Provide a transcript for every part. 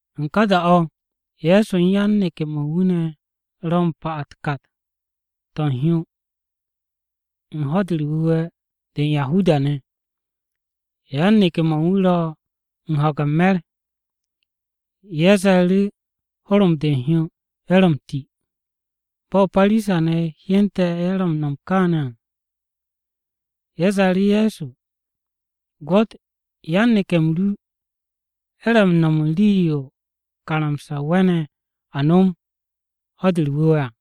U̱n ka da-o̱, Ye̱so u̱n yan-neke̱-mo̱ u̱n wu̱ ne̱ ro u̱n pa u̱n kat-to̱ u̱n hyo, u̱n Ho̱-de u̱r-Wu̱we̱ de u̱n Yahuda-ne̱. Yan-neke̱-mo̱ u̱n wu̱ ro u̱n ho̱ge̱ u̱n me̱r, ye̱ ze̱e̱ru̱ horom u̱n hyo, ye̱ ro m-ti. Bo̱ Parisa-ne̱ hyente̱ ye̱ m-no̱m kaane̱ à, ye̱ ze̱e̱ru̱ Ye̱so, “Gwo̱t, yan-neke̱-m ru ye̱ ro̱ m-no̱m u̱n rii-yo karamsa-o we̱ne̱ a no̱m u̱n Ho̱-de u̱r-Wu̱we̱ à!”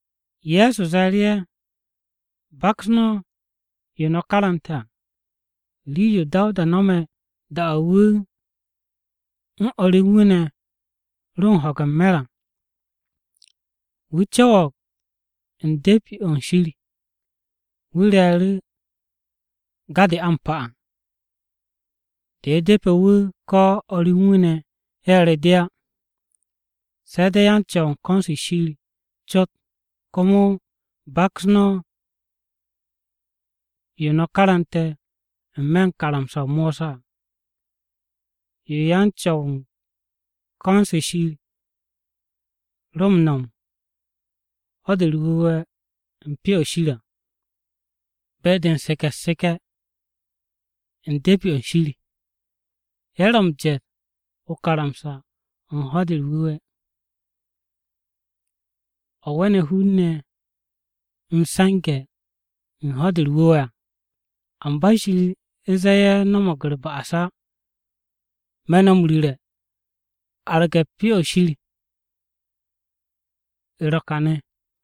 Ye̱so ze̱e̱ru̱ ye̱, “Baks no̱ yo no̱ karante̱ à, rii-yo Dawuda no̱me̱ da-o̱ wu̱ u̱n o̱r u̱n wu̱ ne̱ ro u̱n ho̱ge̱ u̱n me̱r á. Wu̱ co̱wo̱g u̱n De̱pi-o̱ u̱n Shir wu̱ re̱e̱ru̱ ga-de a m-pa à, de depe̱ wu̱, ko̱ o̱r u̱n wu̱ ne̱ ye̱ re de á, se̱ de̱ yan-Co̱w u̱n ko̱n-se Shir cot. Komo baks no̱ yo no̱ karante̱ n-me̱ u̱n karamsa-o Mosa à, yo yan-Co̱w u̱n ko̱n-se Shir ro̱ m-no̱m u̱n Ho̱-de u̱r-Wu̱we̱ u̱n Pyo-o̱ Shir à. Be-de u̱n seke̱ u̱t-seke̱ u̱n De̱pi-o̱ u̱n Shir, ye̱ ro̱ m-jet o-karamsa o̱ u̱n Ho̱-de u̱r-Wu̱we̱, o̱ we̱ne̱ hun-ne̱ m-se̱nge̱ u̱n Ho̱-de u̱r-Wu̱we̱ à. Amba Shir zee ye̱ no̱mo̱g u̱r-ba'as á. Me̱ no̱ m-ru̱re̱, wu̱ arge̱ Pyo-o̱ Shir à, ro̱ kane̱.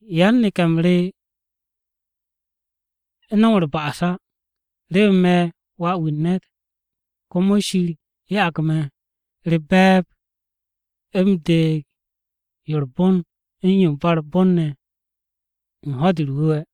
Yan-neke̱-m re no̱m u̱r-ba'as á. Remen me̱ Wà-wu̱ u̱n ne̱t, komo Shir ya'ag me̱ u̱r-be̱e̱b u̱m deeg yo u̱r-bon u̱n yo ba u̱r-bon ne̱ u̱n Ho̱-de u̱r-Wu̱we̱.”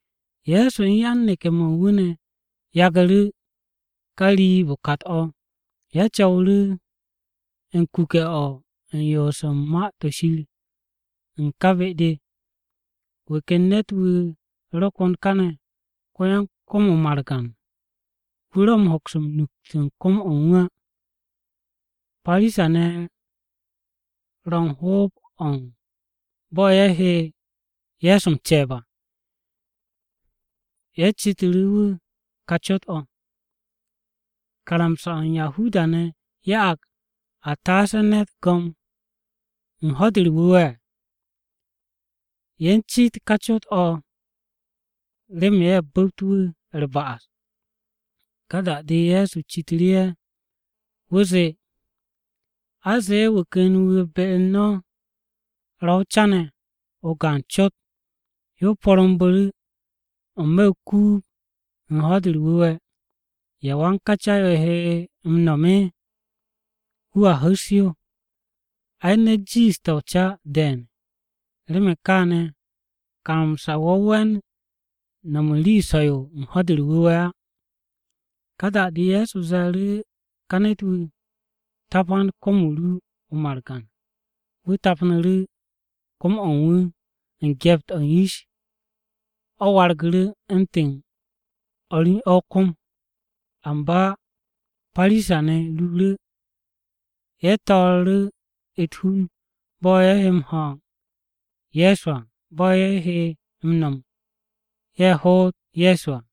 Ye̱so u̱n yan-neke̱-mo̱ u̱n wu̱ ne̱ yagu̱ru̱ ká riib-o kat-o̱. Ye̱ co̱wu̱ru̱ u̱n kuke̱-o̱ u̱n yoos u̱n Ma-to̱ Shir u̱n ká be-de. Wu̱ ken ne̱t-wu̱ ro kon kane̱ ko-yan-kom-o margan. Wu̱ ro̱ m-hoks m-nukt u̱n ka kom-o̱ á. Parisa-ne̱ ro u̱n hoob-o̱ u̱n bo̱ ye̱ he Ye̱so m-ce̱e̱b à. Ye̱ citu̱ru̱ wu̱ ka cot-o̱, “¿Karamsa-o̱ u̱n Yahuda-ne̱ ya'ag a taase ne̱t go̱m u̱n Ho̱-de u̱r-Wu̱we̱?” Ye̱ u̱n cit ká cot-o̱ remen ye̱ bu̱pt wu̱ u̱r-ba'as. Ka da-de Ye̱so citu̱ru̱ ye̱. Wu̱ zee, “A zee wu̱ ken wu̱ be-u̱r no̱ ro̱ o-ca ne̱ o-gaan cot. Yo porumbu̱ru̱ n-me̱ o-kuub u̱n Ho̱-de u̱r-Wu̱we̱. ¿Ya wan ká ca-yo he m-no̱m? Wu̱a hu̱s yo! Ai, ne̱t jiishte̱ o-ca de̱e̱n! Remen kaane̱, karamsa-o o̱ we̱n no̱m u̱n rii so̱-yo u̱n Ho̱-de u̱r-Wu̱we̱ á.” Ka da-de Ye̱so ze̱e̱ru̱ ká ne̱t-wu̱, “Tapan kom-o ru o-margan.” Wu̱ tapnu̱ru̱ kom-o̱ u̱n wu̱. U̱n gyept-o̱ u̱n yish, o̱ wargu̱ru̱ u̱ntu̱n o̱r u̱n o̱ kom-o̱. Amba Parisa-ne̱ ruuru̱, ye̱ to̱o̱ru̱ u̱t-hun, bo̱ ye̱ he m-no̱m ye̱ hoot Ye̱so à.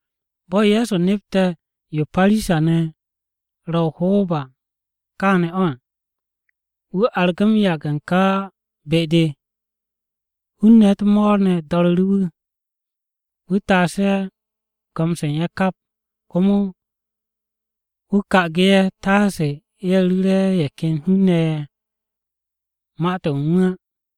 Bo̱ Ye̱so nepte̱ yo Parisa-ne̱ ro̱ o-hoob à kaane̱ o̱ à, wu̱ argu̱ m-yage̱ u̱n ká be-de. Hun-ne̱ u̱t-mo̱o̱r ne̱ do̱ru̱ru̱ wu̱, wu̱ taasu̱ ye̱ go̱m-se u̱n ye̱ kap. Komo wu̱ ka'agu̱ ye̱ taase ye̱ ru̱re̱ ye̱ ken hun-ne̱ ye̱ ma-to̱ u̱n wu̱ á.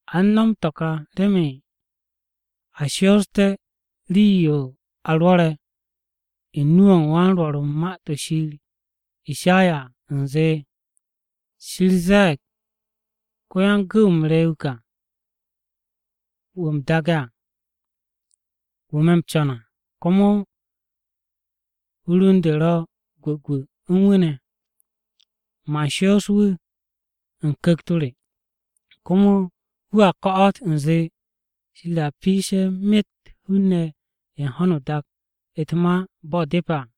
A u̱n no̱m to̱ ka remen a shoosté̱ rii-yo a rwo̱re̱ u̱n nu-o̱ u̱n wan-Rwo̱r u̱n Ma-to̱ ShirIshaya à u̱nze, “Shir ze̱e̱g ko-yan-gu̱w-m re wu̱ ka, wu̱ u̱m daage̱ à, wu̱ me̱ m-co̱n à. Komo hur u̱n de ro̱ gwu̱gwu̱ u̱n wu̱ ne̱. Man shoos wu̱ u̱n Ku̱kt-o re, komo wu̱a ko̱'o̱t u̱nze Shir a piishe̱ myet hun-ne̱ ye̱ u̱n ho̱no o-dak u̱t-ma bo̱ depe̱ à.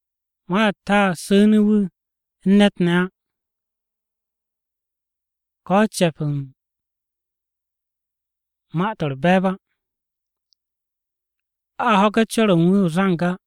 Ma-u̱t a su̱nu̱ wu̱ u̱n ne̱t ne̱ á, ko̱ ce̱p u̱n ma-to̱ u̱r-be̱e̱b á. A ho̱ge̱ cor-o̱ u̱n wu̱ o-zang á.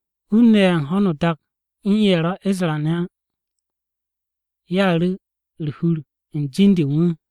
Hun-ne̱ ye̱ u̱n ho̱no o-dak u̱n ye̱ ro̱ Yahuda-ne̱ á, ye̱a ru̱ u̱r-hur u̱n jin-de u̱n wu̱.”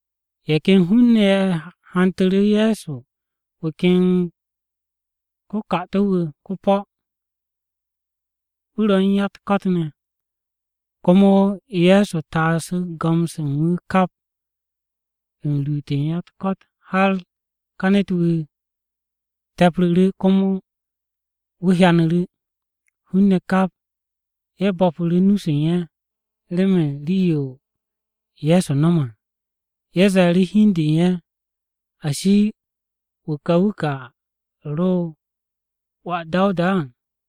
Ye̱ ken hun-ne̱ ye̱ hantu̱ru̱ Ye̱so wu̱ ken ko-'kato̱ wu̱ ko-po̱, wu̱ ro u̱n ya-u̱t-ko̱t ne̱. Komo Ye̱so taasu̱ go̱m-se u̱n wu̱ kap, u̱n ruut u̱n ya-u̱t-ko̱t har ká ne̱t-wu̱ te̱pru̱ru̱, komo wu̱ hyanu̱ru̱. Hun-ne̱ kap ye̱ bo̱pu̱ru̱ nu-se u̱n ye̱, remen rii-yo Ye̱so no̱me̱ à. Ye̱ ze̱e̱ru̱ hi u̱n de u̱n ye̱, “¿Ashi, wu̱ ka wu̱ ka ro̱ wà Dawuda à?”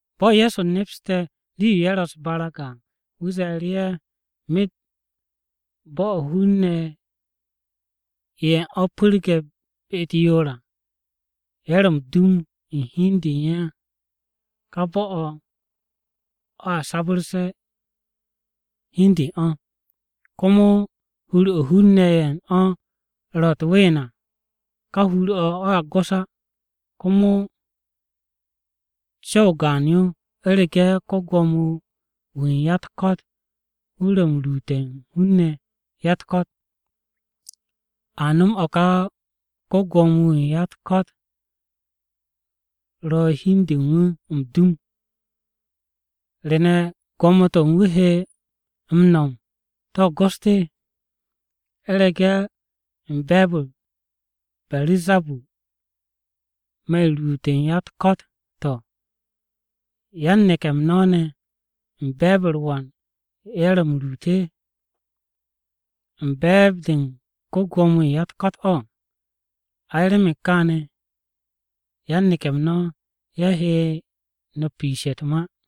Bo̱ Ye̱so nepste̱ rii-yo ye̱ ro̱ u̱s-barag à, wu̱ ze̱e̱ru̱ ye̱, “Myet bo̱-o̱ hun-ne̱ ye̱ u̱n o̱ pu̱rge̱ be-u̱t yoor à, ye̱ ro̱ m-dum u̱n hi u̱n de u̱n ye̱ à, ká bo̱-o̱, o̱a sabu̱rse̱ hi u̱n de u̱n o̱. Komo hur-o̱ hun-ne̱ ye̱ u̱n o̱ ro̱ u̱t-ween à, ká hur-o̱, o̱a gos á. Komo co̱w-o gaan-yo, u̱rege̱ ko-Gwo̱mo-wu̱ u̱n ya-u̱t-ko̱t wu̱ ro̱ m-ruute̱ u̱n hun-ne̱ ya-u̱t-ko̱t, a nom o̱ ka ko-Gwo̱mo-wu̱ u̱n ya-u̱t-ko̱t ro̱ hi u̱n du u̱n wu̱ m-dum. ¿To̱ re ne̱ gwo̱mo-to̱ u̱n wu̱ he m-no̱m to̱ gost? ¿U̱rege̱ u̱n be̱e̱b-u̱r Beru̱zabur me̱ m-ruut u̱n ya-u̱t-ko̱t, to̱, yan-neke̱-m no̱ ne̱ u̱n be̱e̱b-u̱r wan ye̱ ro̱ ye̱ m-ruute̱? ¿U̱n be̱e̱b-de u̱n ko-Gwo̱mo-wu̱ u̱n ya-u̱t-ko̱t? Ay! Remen kaane̱, yan-neke̱-m no̱ ye̱ he no̱ piishe̱ u̱n to̱ ka ma-to̱.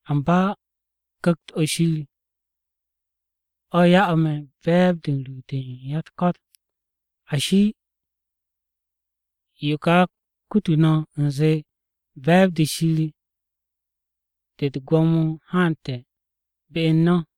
Amba Ku̱kt-o̱ Shir o̱ ya'u̱ me̱ be̱e̱b-de u̱n ruut u̱n ya-u̱t-ko̱t, ashi, yo ka kututu̱ no̱ u̱nze be̱e̱b-de Shir de u̱t-gwo̱mo haante̱ be u̱n no̱.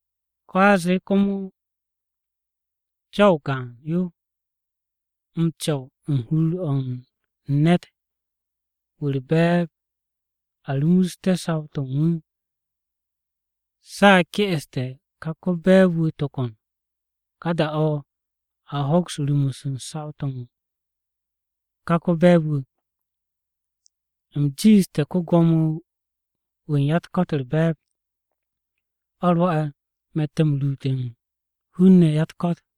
Ko̱ a zee komo co̱w-o gaan-yo m-co̱w u̱n hur-o̱ u̱n ne̱t-wu̱ u̱r-be̱e̱b a rumusté̱ saw-to̱ u̱n wu̱. Se̱ a ke'este̱ ká ko-be̱e̱b-wu̱ tokon, ka da-o̱ a hoks m-rumus u̱n saw-to̱ u̱n ká ko-be̱e̱b-wu̱. U̱m jiishte̱ ko-Gwo̱mo-wu̱ u̱n ya-u̱t-ko̱t u̱r-be̱e̱b, o̱ rwo̱'e̱ me̱tte̱ u̱n ruute̱ u̱n hun-ne̱ ya-u̱t-ko̱t.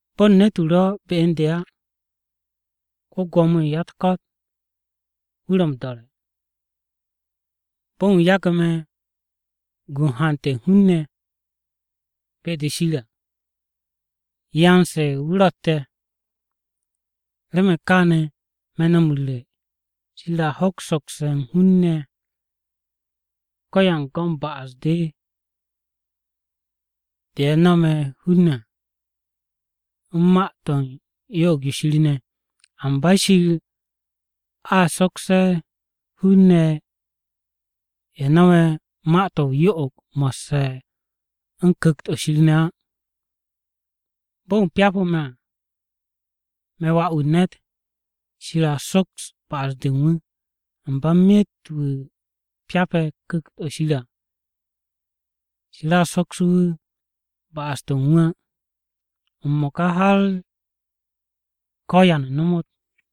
“Bo̱n ne̱t-wu̱ ro̱ be u̱n de á, ko-Gwo̱mo-wu̱ u̱n ya-u̱t-ko̱t wu̱ ro̱ m-do̱re̱. Bo̱n wu̱ yagu̱ me̱ gu u̱n hante̱ u̱n hun-ne̱ be-de Shir à, yan-se u̱n ye̱ wu̱ ro̱tte̱. “Remen kaane̱ me̱ no̱ m-ru̱re̱, Shir a hoks sokse̱ u̱n hun-ne̱ ko-yan-go̱n ba'as-de ye̱ nome̱ hun-ne̱ à, u̱n ma-to̱ u̱n yo'og-o̱ Shir ne̱. Amba Shir a sokse̱ hun-ne̱ ye̱ no̱me̱ ma-to̱ o-yo'og mo̱sse̱ u̱n Ku̱kt-o̱ Shir ne̱ á. Bo̱n wu̱ pyapu̱ me̱ à, me̱ Wà-wu̱ u̱n ne̱t Shir a soks ba'as-de u̱n wu̱. Amba myet wu̱ pyape̱ Ku̱kt-o̱ Shir à, Shir a soksu̱ wu̱ ba'as-to̱ u̱n wu̱ á, m-mo̱ka har ko̱ ya nomot.”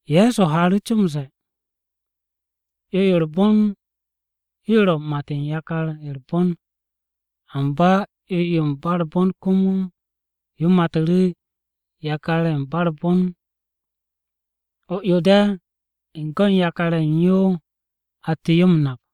Ye̱so haaru̱ co m-ze̱e̱, “'Yo-yo u̱r-bon yo ro̱ u̱n mat u̱n yakar-ye̱ u̱r-bon. Amba 'Yo-yo ba u̱r-bon komo yo matu̱ru̱ yakar-ye̱ ba u̱r-bon. O-'yo de̱, u̱n go̱n yakar-ye̱ u̱n yo atte̱ yo m-nap.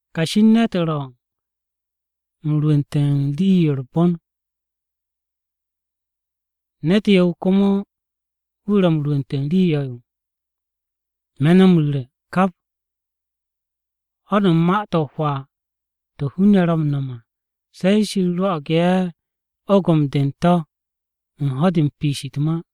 Kashi u̱n ne̱t ro̱ m-rwu̱nte̱ u̱n rii-yo u̱r-bon. Ne̱t yo̱-wu̱ komo wu̱ ro̱ m-rwu̱nte̱ rii yo̱-yo. Me̱ no̱ m-ru̱re̱, kap ho̱n u̱n ma-to̱ o-hwaa to̱ hun-ne̱ ro̱ m-no̱m à, se̱ Shir rwo̱'o̱g ye̱ ogom-de u̱n to̱ u̱n ho̱-de u̱n piish u̱t-ma.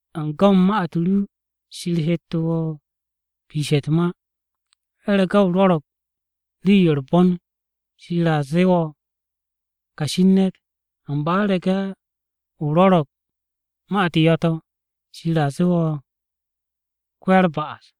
U̱n go̱n ma-u̱t ru Shir hette̱ wo̱ piishe̱ u̱t-ma, u̱rege̱ o rwo̱ro̱g rii-yo u̱r-bon, Shir a zee wo̱ kashi u̱n ne̱t. Amba u̱rege̱ o rwo̱ro̱g ma-u̱t yo̱-to̱, Shir a zee wo̱ ko-ya-u̱r-ba'as.”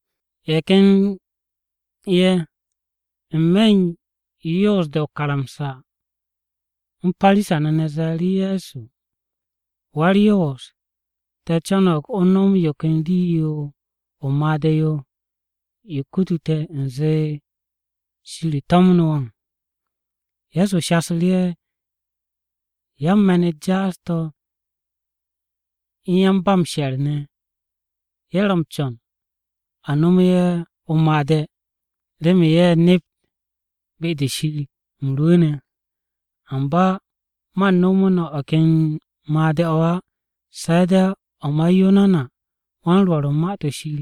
Ye̱ ken ye̱ n-me̱ u̱n yan-Yoos-de o-karamsa u̱n Parisa-ne̱ ze̱e̱ru̱ Ye̱so, “Wa-u̱r-Yoos, te̱ co̱no̱g o nom yo ken rii-yo o-made̱ yo, yo kutu te̱ u̱nze Shir to̱mnu̱ wo̱.” Ye̱so shasu̱ru̱ ye̱, “Yan-me̱n-u̱t jaas-to̱ u̱n yan-ba-m-she̱r ne̱, ye̱ ro̱ m-co̱n a nomo ye̱ o-made̱ remen ye̱ nept be-de Shir u̱m rwu̱u̱ne̱. Amba man nomo no̱ o̱ ken made̱-o̱ á, se̱ de̱ o̱ ma Yunanawan-Rwo̱r u̱n Ma-to̱ Shir.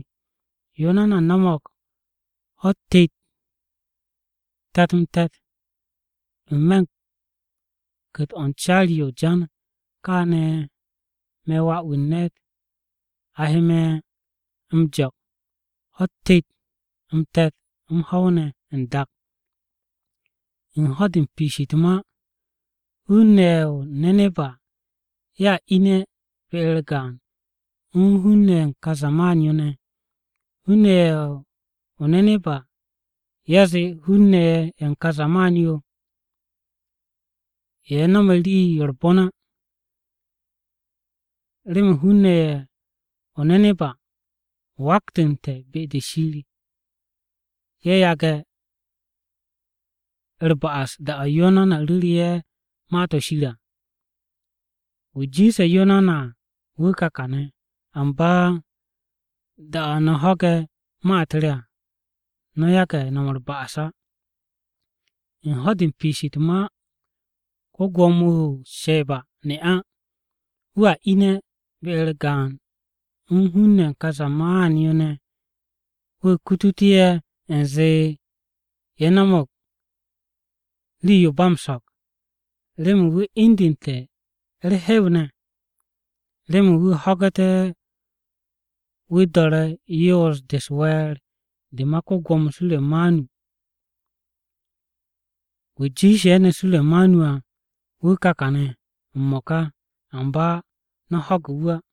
Yunana no̱mo̱g ho̱-u̱t tet, te̱t-m tet, n-me̱ u̱n ku̱t-o̱ u̱n caari-o̱ o-jan. Káane̱ me̱ Wà-wu̱ u̱n ne̱t a he me̱ m-jo̱k ho̱-u̱t tet, m-te̱t, m-ho̱w ne̱ n-dak. “U̱n ho̱-de u̱n piish u̱t-ma, hun-ne̱ ye̱ o-Neneba ye̱a ine̱ be-u̱r gaan u̱n hun-ne̱ ye̱ u̱n kà zaman-yo ne̱. Hun-ne̱ ye̱ o-Neneba ye̱a zee hun-ne̱ ye̱ u̱n ka zaman-yo, ye̱ no̱m rii-yo u̱r-bon á. Remen hun-ne̱ ye̱ o-Neneba waktu̱nte̱ be-de Shir ye̱ yage̱ u̱r-ba'as da-o̱ Yunana ru̱ru̱ ye̱ Ma-to̱ Shir à. Wu̱ jiishe̱ Yunana à wu̱ ka kàne̱, amba da-o̱ no̱ ho̱ge̱ ma-u̱t re à, no̱ yage̱ no̱m u̱r-ba'as á. U̱n ho̱-de u̱n piish u̱t-ma, ko-Gwo̱mo-wu̱ o-Sheba ne'a, wu̱a ine̱ be-u̱r gaan u̱n hun-ne̱ ye̱ u̱n ka zaman-yo ne̱, wu̱ kutute̱ ye̱, u̱nze ye̱ no̱mo̱g rii-yo ba m-so̱k. Remen wu̱ indu̱nte̱ u̱r-hew ne̱, remen wu̱ ho̱gu̱te̱ wu̱ do̱re̱ yoos-de u̱s-we̱e̱r de ma ko-Gwo̱mo Suremanu. Wu̱ jiishe̱ ne̱ Suremanu à wu̱ ka kàne̱ m-mo̱ka, amba no̱ ho̱ge̱ wu̱ á.”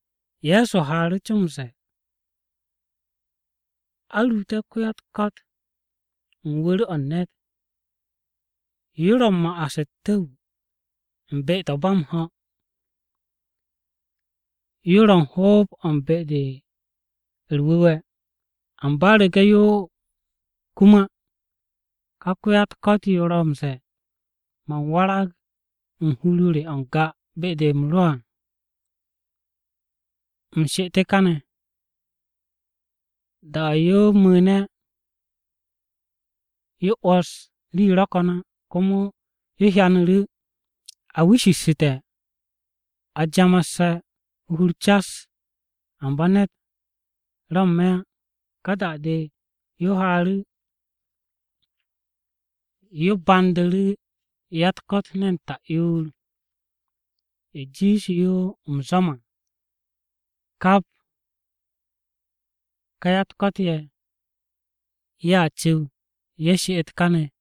Ye̱so haaru̱ co m-ze̱e̱, “A ruute̱ ko-ya-u̱t-ko̱t u̱n wu̱r-o̱ u̱n ne̱t. Yo ro̱ m-ma'as u̱t-tu̱w u̱n be-to̱ ba m-ho̱. Yo ro̱ u̱n hoob-o̱ u̱n be-de u̱r-wu̱we̱. Amba u̱rege̱ yo kum á, ka ko-ya-u̱t-ko̱t yo ro̱ m-ze̱e̱, ‘Man warag u̱n hur-o re o̱ n-ga be-de u̱m rwu̱u̱ne̱ à, u̱m she'et kane̱.’ Da-o̱ yo mu̱u̱ne̱ yo 'wo̱s rii ro̱ ko̱n á, komo yo hyanu̱ru̱ a wishishsu̱te̱, a jamasse̱ o-hur cas, amba ne̱t ro̱ n-me̱ á. Ka da-o̱ yo haaru̱ yo bandu̱ru̱ ya-u̱t-ko̱t ne̱n ta'yoor, ye̱ jiishe̱ yo m-zwo̱m à. Kap kà ya-u̱t-ko̱t ye̱, ye̱a cu̱w, ye̱ she'et káne̱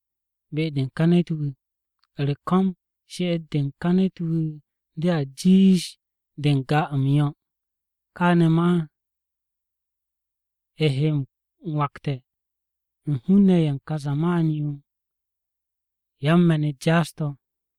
be-de u̱n ká ne̱t-wu̱. U̱r-ko̱m, she'et-de u̱n ká ne̱t-wu̱ dea jiish de n-ga m-yo̱. Káane̱ ma he m-wakte̱ u̱n hun-ne̱ ye̱ u̱n ka zaman-yo ne̱ yan-me̱n-u̱t jaas-to̱.”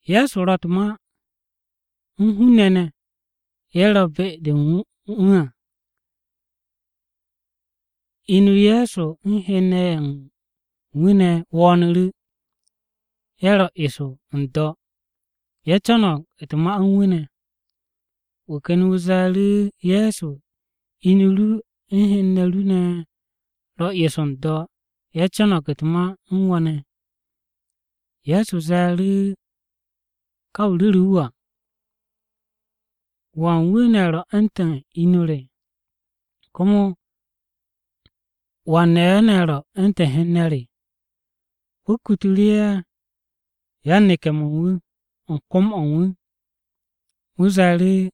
Ye̱so ro̱ u̱t-ma u̱n hun-ne̱ ne̱ ye̱ ro̱ be-de u̱n wu̱ à, inu-o Ye̱so u̱n hen-ne̱ ye̱ u̱n wu̱ ne̱ wo̱o̱nu̱ru̱. Ye̱ ro eso n-do̱. Ye̱ co̱no̱g u̱t-ma u̱n wu̱ ne̱. Wu̱ ken wu̱ ze̱e̱ru̱ Ye̱so, “Inu ru u̱n hen-ne̱ ru ne̱ ro̱ eso n-do̱, ye̱ co̱no̱g u̱t-ma u̱n wo̱ ne̱.” Ye̱so ze̱e̱ru̱ ká wu̱ ru̱ru̱ wu̱ à, “¿Wan wu̱ ne̱ ro̱ u̱ntu̱n inu re? ¿Komo wan-ne̱ ye̱, ro̱ u̱ntu̱n hen-ne̱ re?” Wu̱ kutu̱ru̱ ye̱ yan-neke̱-mo̱ u̱n wu̱ u̱n kom-o̱ u̱n wu̱. Wu̱ ze̱e̱ru̱,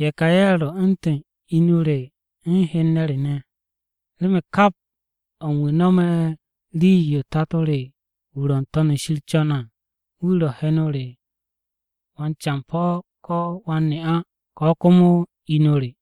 “Ye̱ ka ye̱ ro̱ u̱ntu̱n inu re u̱n hen-ne̱ re ne̱. Remen kap o̱ u̱n wu̱ no̱me̱ rii-yo Tato re wu̱ ro̱ n-To̱n shir co̱ne̱ à, wu̱ ro̱ heno re, wan-campo̱ ko̱ wan-ne'a ko̱ komo inu re.”